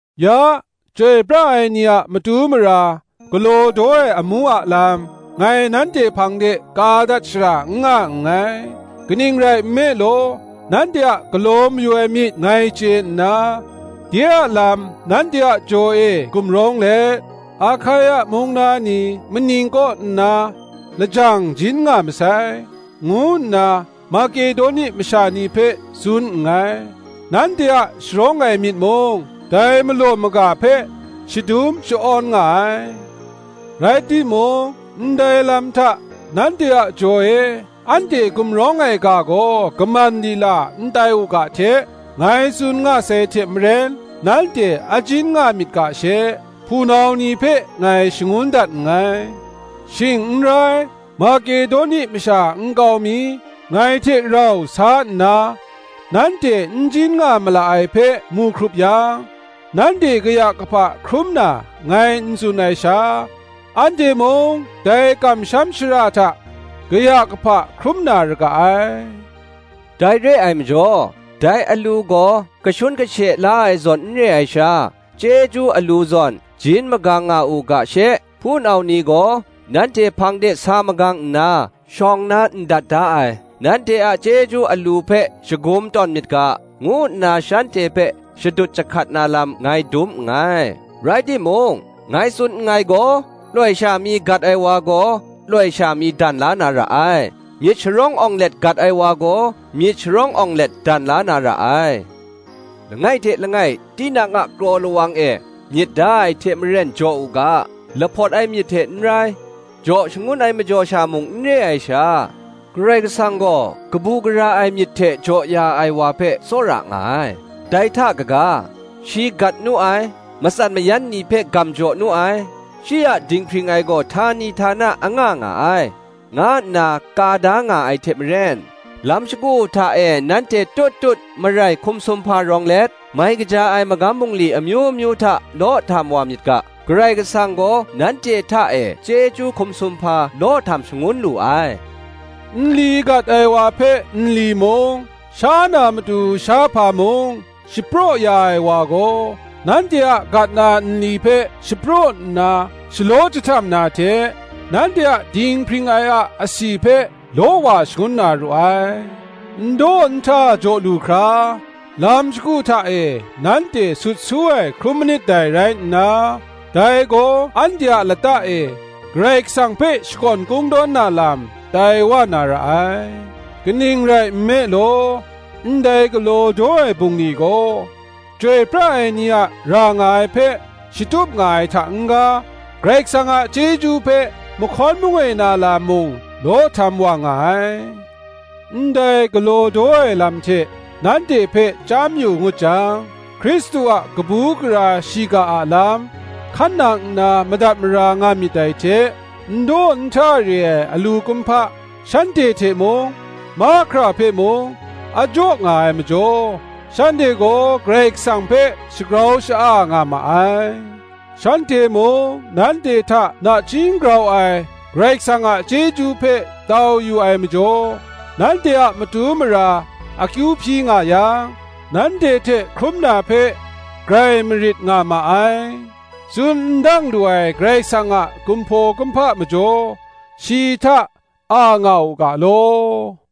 Ya, chyoi pra ai ni a matu mara galaw daw ai amu a lam, ngai nanhte hpang de ka dat shara n nga nngai. Kaning rai nme law nanhte a galaw mayu ai myit ngai chye nna, de a lam nanhte a jaw e gumrawng let, Ahkaia mung na ni maning kaw nna lajang jin nga masai, ngu nna Makedoni masha ni hpe tsun nngai: nanhte a sharawng ai myit mung, dai malaw maga hpe shadum sha-awn nga ai. Rai timung, ndai lam hta nanhte a jaw e anhte gumrawng ai ga gaw kaman lila n tai u ga hte, ngai tsun nga sai hte maren nanhte a jin nga myit ga she, hpunau ni hpe ngai shangun dat nngai: shing n rai, Makedoni masha nkau mi ngai hte rau sa nna nanhte n jin nga mala ai hpe mu hkrup yang, nanhte kaya kahpa hkrum na ngai n tsun ai sha, anhte mung dai kamsham shara hta kaya kahpa hkrum na ra ga ai. Dai re ai majaw, dai alu gaw kashun kashe la ai zawn n re ai sha, chyeju alu zawn jin magang nga u ga she, hpunau ni gaw nanhte hpang de sa magang nna, shawng na ndat da ai, nanhte a chyeju alu hpe shagum tawn myit ga, ngu nna shanhte hpe shadut jahkat na lam ngai dum nngai. Rai timung, ngai tsun nngai gaw, loi sha mi gat ai wa gaw loi sha mi dan la na ra ai; myit sharawng awng let gat ai wa gaw, myit sharawng awng let dan la na ra ai. Langai hte langai tinang a kraw lawang e myit da ai hte maren jaw u ga: lahpawt ai myit hte n rai, jaw shangun ai majaw sha mung n re ai sha, Karai Kasang gaw kabu gara ai myit hte jaw ya ai wa hpe tsawra nga ai. Dai hta kaga, Shi gat nu ai, matsan mayan ni hpe gam jaw nu ai: Shi a dinghpring ai gaw htani htana anga nga ai, nga nna ka da nga ai hte maren, lam shagu hta e nanhte tut tut marai hkum sumhpa rawng let, mai kaja ai magam bungli amyu myu hta law htam wa myit ga, Karai Kasang gaw nanhte hta e chyeju hkum sumhpa law htam shangun lu ai. Nli gat ai wa hpe nli mung, sha na matu shahpa mung shapraw ya ai wa gaw, nanhte a gat na nli hpe shapraw nna shalaw jahtam na hte, nanhte a dinghpring ai a asi hpe law wa shangun na ru ai. N daw n hta jaw lu hkra, lam shagu hta e nanhte sut su ai hkrum manit dai rai nna, dai gaw anhte a lata e, Karai Kasang hpe shakawn kungdawn na lam tai wa na ra ai. Kaning rai nme law, ndai galaw daw ai bungli gaw, chyoi pra ai ni a ra nga ai hpe shatup nga ai hta n-ga, Karai Kasang a chyeju hpe mahkawn mangoi na lam mung law htam wa nga ai: ndai galaw daw ai lam hte nanhte hpe chyam yu ngut jang, Hkristu a kabu gara shiga a lam hkan nang nna madat mara nga myit dai hte, n daw n hta re ai alu kumhpa, shanhte hpe mung, mahkra hpe mung, a jaw nga ai majaw, shanhte gaw Karai Kasang hpe shagrau sha-a nga ma ai: shanhte mung nanhte hta nachying grau ai Karai Kasang a chyeju hpe tau yu ai majaw, nanhte a matu mara akyu hpyi nga yang, nanhte hte hkrum na hpe grai marit nga ma ai. Tsun n dang lu ai Karai Kasang a kumhpaw kumhpa majaw, shi hta a nga u ga law.